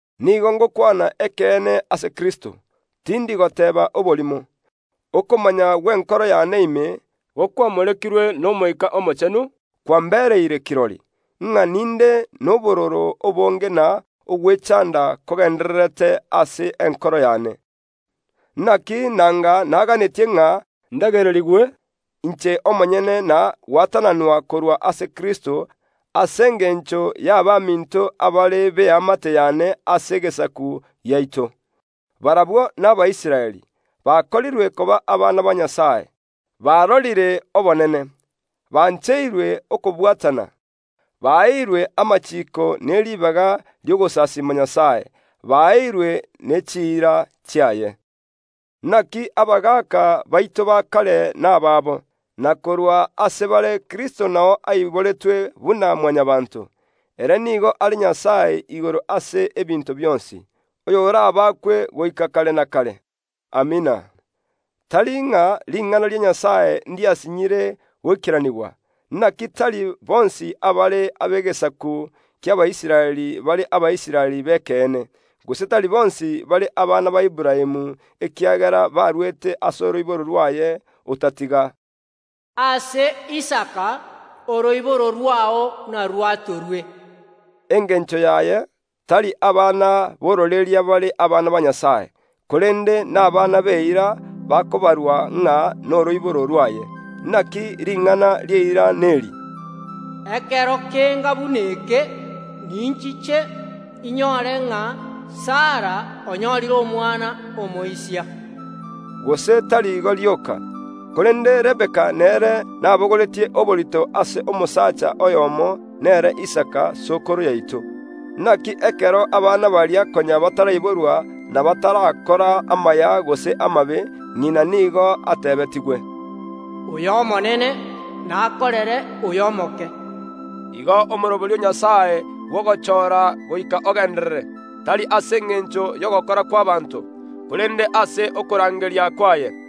Nigo ngokwana ekeene ase Kristo, tindi goteeba oborimo. Okomanya gw’enkoro y’ane ime, gokwamorekirwe n’Omoika Omochenu, kwambereire kirori, ng’a ninde nobororo obonge na ogwechanda kogendererete ase enkoro y’ane. Inaki nanga naganetie ng’a ndagererigwe inche omonyene na gwatananwa korwa ase Kristo ase engencho y’abaminto abare b’eamate y’ane ase egesaku giaito. Barabwo n’Abaisraeli, bakorirwe koba Abana ba Nyasae, barorire, obonene, bancheirwe okobwatana, baeirwe amachiiko ne ribaga ri’ogosasiima Nyasae, baeirwe ne chiira chiaye. Inaki abagaaka baito ba kare nabaabo, na korwa ase bare Kristo nao aiboretwe buna Mwanyabaanto; ere nigo are Nyasae igoro ase ebinto bionsi, oy’orabakwe goika kare na kare. Amina. Tari ng’a ring’ana ria Nyasae ndiasinyire goikeranigwa. Inaki tari bonsi abare b’egesaku ki’Abaisraeli bare Abaisraeli b’ekeene; gose tari bonsi bare abana ba Aburaamu ekiagera baruete ase oroiboro rw’aye, otatiga, “Ase Isaka oroiboro rwao narwatorwe.” Engencho yaye, tari abana b’ororeria bare Abana ba Nyasae, korende n’abana b’eira bakobarwa ng’a noroiboro rw’aye. Inaki ring’ana ri’eira neri, “Ekero kenga buna eke ninchiche, inyore ng’a Sara onyorire omwana omoisia.” Gose tari igo rioka, korende Rebeka nere nabogoretie oborito ase omosacha oyomo, nere Isaka sokoro yaito. Inaki ekero abana baria konya bataraiborwa na batarakora amaya gose amabe, ng’ina nigo atebetigwe, “Oyo omonene namokorere oyio omoke.” Igo omoroberio o Nyasae bw’ogochoora goika ogenderere, tari ase engencho y’ogokora kw’ abanto, korende ase okorangeria kwaye.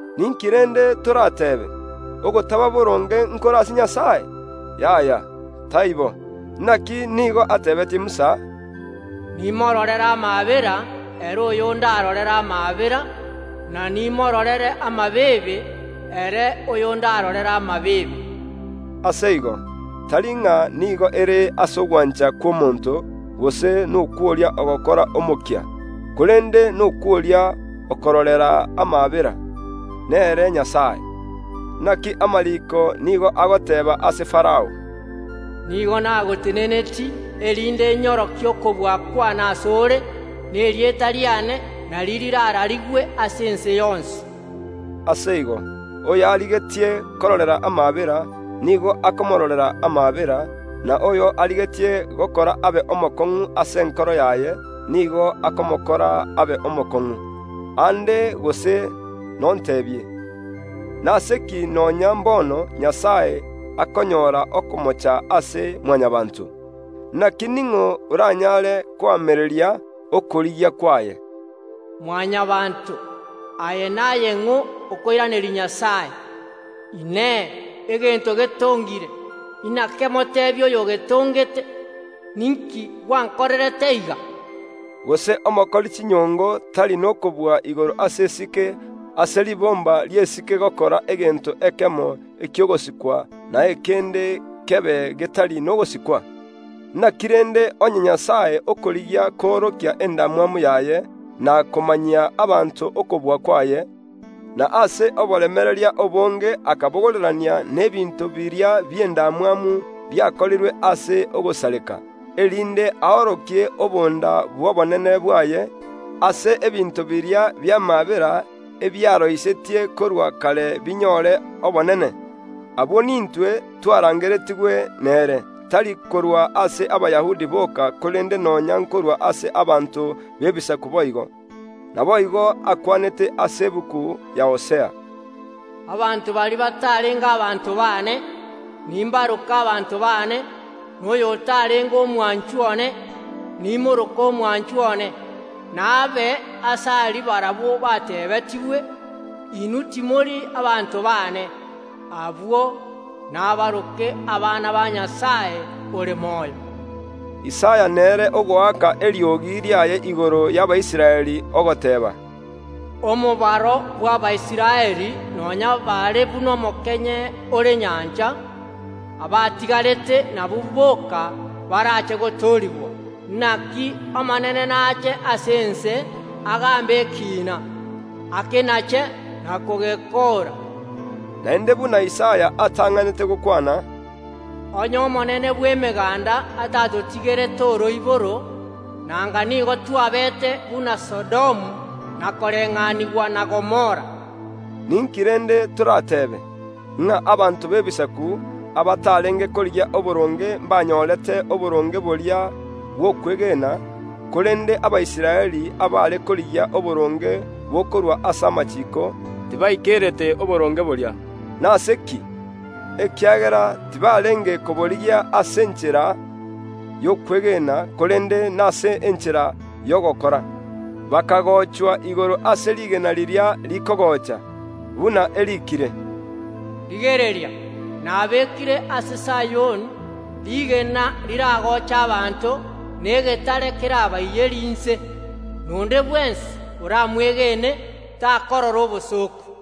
Ninki rende torateebe? Ogotaba boronge nkore ase Nyasae? Yaya, taibo! Inaki nigo atebeetie Musa, “Nimororere amaabera ere oyo ndarorere amaabera, na nimororere amabeebe ere oyo ’ndarorere amabeebe.” Ase igo, tari ng’a nigo ere ase ogwancha kw’omonto, gose nokw’oria ogokora omokia, korende nokw’oria okororera amaabera, nere Nyasae. Inaki amariiko nigo agoteeba ase Farao, “Nigo nagotenenetie, erinde nyorokie okobua kw’ane ase ore, na erieta riane nario rirararigwe ase ense yonsi.” Ase igo, oyo arigetie kororera amaabera, nigo akomoororera amaabera, na oyo arigetie gokora abe omokong’u ase enkoro yaye, nigo akomokora abe omokong’u. Aande gose nonteebie, “Nase ki nonya mbono Nyasae akonyora okomocha ase Mwanyabaanto? Inaki ning’o oranyare koamereria okorigia kwaye?” Mwanyabaanto, aye naye ng’o okoiraneria Nyasae? Inee! Egento getongire nakemoteebie oyogetongete, “Ninki gwankorerete iga?” Gose omokori chinyongo tari n’okobua igoro ase esike, ase ribomba ri’esike gokora egento ekemo eki’ogosikwa, na ekende kebe getari nogosikwa? Inaki rende onye Nyasae okorigia koorokia endamwamu yaye, na komanyia abanto okobua kwaye, na ase oboremereria obonge akabogorerania n’ebinto biria bi’endamwamu biakorirwe ase ogosareka, erinde aorokie obonda bw’obonene bwaye, ase ebinto biria bi’amaabera ebiaroisetie korwa kare binyore obonene? Abwo nintwe, twarangeretigwe nere, tari korwa ase Abayahudi boka, korende nonya nkorwa ase abanto b’Ebisaku boigo. Naboigo akwanete ase egetabu ya Hosea, “Abanto baria batarenge abanto baane, nimbaroke abanto baane; na oyotarenge omwanchwa one, nimoroke omwanchwa one.” “N’abe aase aria barabwo bateebetigwe: Inwe timori abanto baane, abwo inabarokwe abana ba Nyasae ore moyo.” Isaya nere ogoaka eriogi riaye igoro y’Abaisraeli, ogoteeba, “Omobaro bw’Abaisraeli n’oba buna omokenye ore nyancha, abatigari nabwo boka barache gotoorigwa; inaki Omonene n’ache ase ense agaambe ekiina, akenache na kogekoora.” Naende buna Isaya atang’anete gokwana. “Onye Omonene bw’Emeganda atatotigerete oroiboro, nanga nigo twabeete buna Sodomu, na koreng’anigwa na Gomora.” Ninki rende torateebe? Ng’a abanto b’Ebisaku, abatarenge korigia oboronge ’mbanyorete oboronge boria bw’okwegena; korende Abaisraeli abare korigia oboronge bokorwa ase amachiiko, tibaikerete oboronge boria. Nase ki? Ekiagera tibarenge koborigia ase enchera y’okwegena, korende nase enchera y’ogokora, bakagochwa igoro ase rigena riria rikogocha; buna eriikire, “Rigereria, nabekire ase Sayoni rigena riragoche abanto, na egetare kerabaiyerie inse, na onde bwensi oramwegene takorora obosooku.”